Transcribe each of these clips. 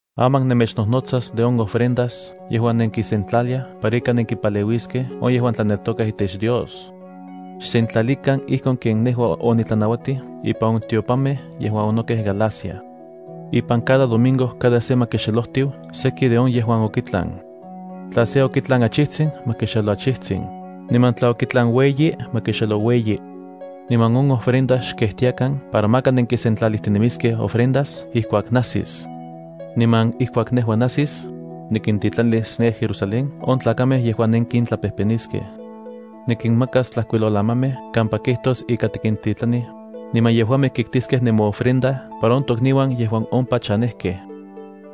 Aman nemechnojnotsas de on ofrendas yejuan nenkisentlaliaj para ika nenkimpaleuiskej on yejuan tlaneltokaj itech Dios. Xsentlalikan ijkon ken nejua onitlanauatij ipan on tiopanmej yejuan onokej Galacia. Ipan cada domingo cada se ma kixelojtiu seki de on yejuan okitlan. Tla se okitlan achitsin, ma kixelo achitsin, niman tla okitlan ueyi, ma kixelo ueyi. Niman on ofrenda xkejtiakan para maka nenkisentlalijtinemiskej ofrendas ijkuak najsis. Niman ijkuak nejua najsis, nikintitlanis ne Jerusalén on tlakamej yejuan nenkintlapejpeniskej. Nikinmakas tlajkuilolamamej kampa kijtos ika tikintitlanij, niman yejuamej kitkiskej nemoofrendas para on tokniuan yejuan ompa chanejkej.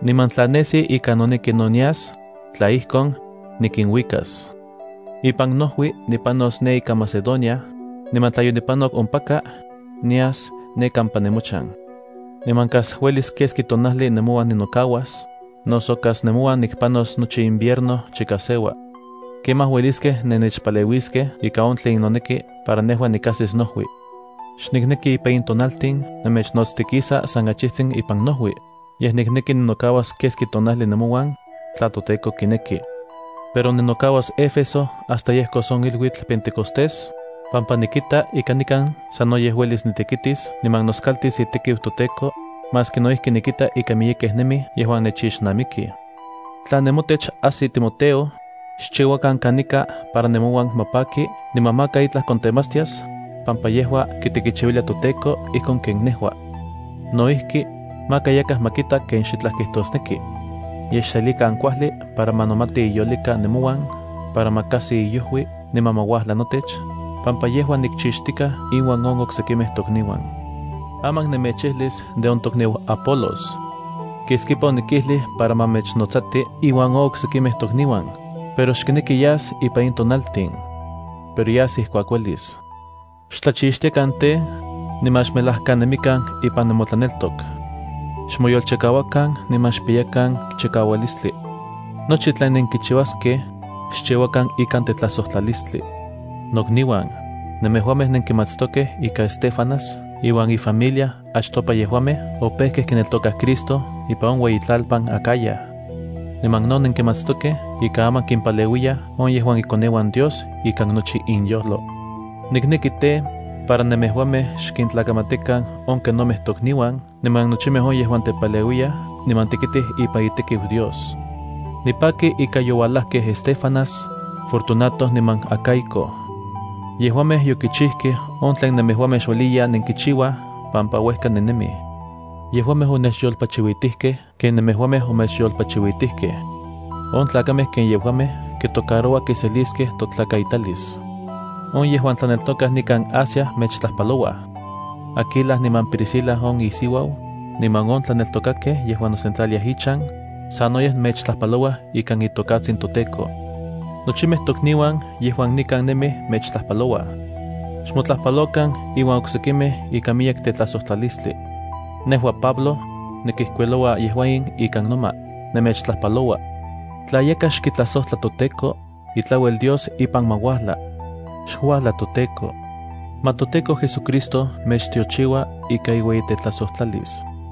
Niman tla nesi ika noneki no nias, tla ijkon, nikinuikas. Ipan nojui nipanos ne ika Macedonia, niman tla yonipanok ompaka, nias ne kampa nemochan. Niman kas uelis keski tonajli nemouan ninokauas, noso kas nemouan nikpanos nochi invierno chika seua. Kemaj ueliskej nennechpaleuiskej ikan on tlen noneki para nejua nikajsis nojui. Xnikneki ipan in tonaltin nemechnotstikisa san achijtsin ipan nojui, yej nikneki ninokauas keski tonajli nemouan, tla toTEKO kineki. Pero ninokauas nikan Éfeso hasta yejkos on iluitl Pentecostés, pampa nikita ika nikan sanoyej uelis nitekitis niman noskaltis itekiu toTEKO, maski no ijki nikita ika miyekej nemij yejuan nechixnamikij. Tla nemotech ajsi Timoteo, xchiuakan kanika para nemouan ma paki niman maka itlaj kontematstias, pampa yejua kitekichiuilia toTEKO ijkon ken nejua. No ijki, maka yakaj ma kita ken xitlaj kijtosneki. Yej xselikan kuajli para ma nomati iyolika nemouan para ma kajsi iojui niman ma uajla notech, pampa yejua nikchixtikaj inuan on oksekimej tokniuan. Aman nemechijlis de on tokniu Apolos. Keskipa onikijlij para ma mechnotsati iuan on oksekimej tokniuan, pero xkineki yas ipan in tonaltin. Pero yas ijkuak uelis. Xtlachixtiakan tej, niman xmelajkanemikan ipan nemotlaneltok. Xmoyolchikauakan niman xpiyakan chikaualistli. Nochi tlen nenkichiuaskej, xchiuakan ikan tetlajsojtlalistli. Nokniuan, nemejuamej nenkimatstokej ika Estéfanas iuan ifamilia achtopa yejuamej opejkej kineltokaj Cristo ipan on ueyitlalpan Acaya. Niman no nenkimatstokej ika aman kimpaleuiyaj on yejuan ikoneuan Dios ikan nochi inyojlo. Nikneki tej, para nemejuamej xkintlakamatikan on kenomej tokniuan niman nochimej on yejuan tepaleuiyaj niman tekitij ipan itekiu Dios. Nipaki ika youalajkej Estéfanas, Fortunato niman Acaico. Yejuamej yokichijkej on tlen nemejuamej xueliya nenkichiuaj pampa uejka nennemij. Yejuamej onechyolpachiuitijkej ken nemejuamej omechyolpachiuitijkej. On tlakamej ken yejuamej kitocaroua kiseliskej totlakaitalis. On yejuan tlaneltokaj nikan Asia mechtlajpalouaj. Aquila niman Priscila, on isiuau, niman on tlaneltokakej yejuan nosentlaliaj ichan, sanoyej mechtlajpalouaj ikan itokatsin toTEKO. Nochimej tokniuan yejuan nikan nemij mechtlajpalouaj. Xmotlajpalokan inuan oksekimej ikan miyek tetlajsojtlalistlia. Nejua, Pablo, nikijkuiloua yejua in ikan noma: “Nemechtlajpaloua.” Tla yakaj xkitlajsojtla toTEKO, itlauel Dios ipan ma uajla. ¡Xuajla ToTEKO! Ma toTEKO JesuCristo mechtiochiua ika iueyitetlajsojtlalis.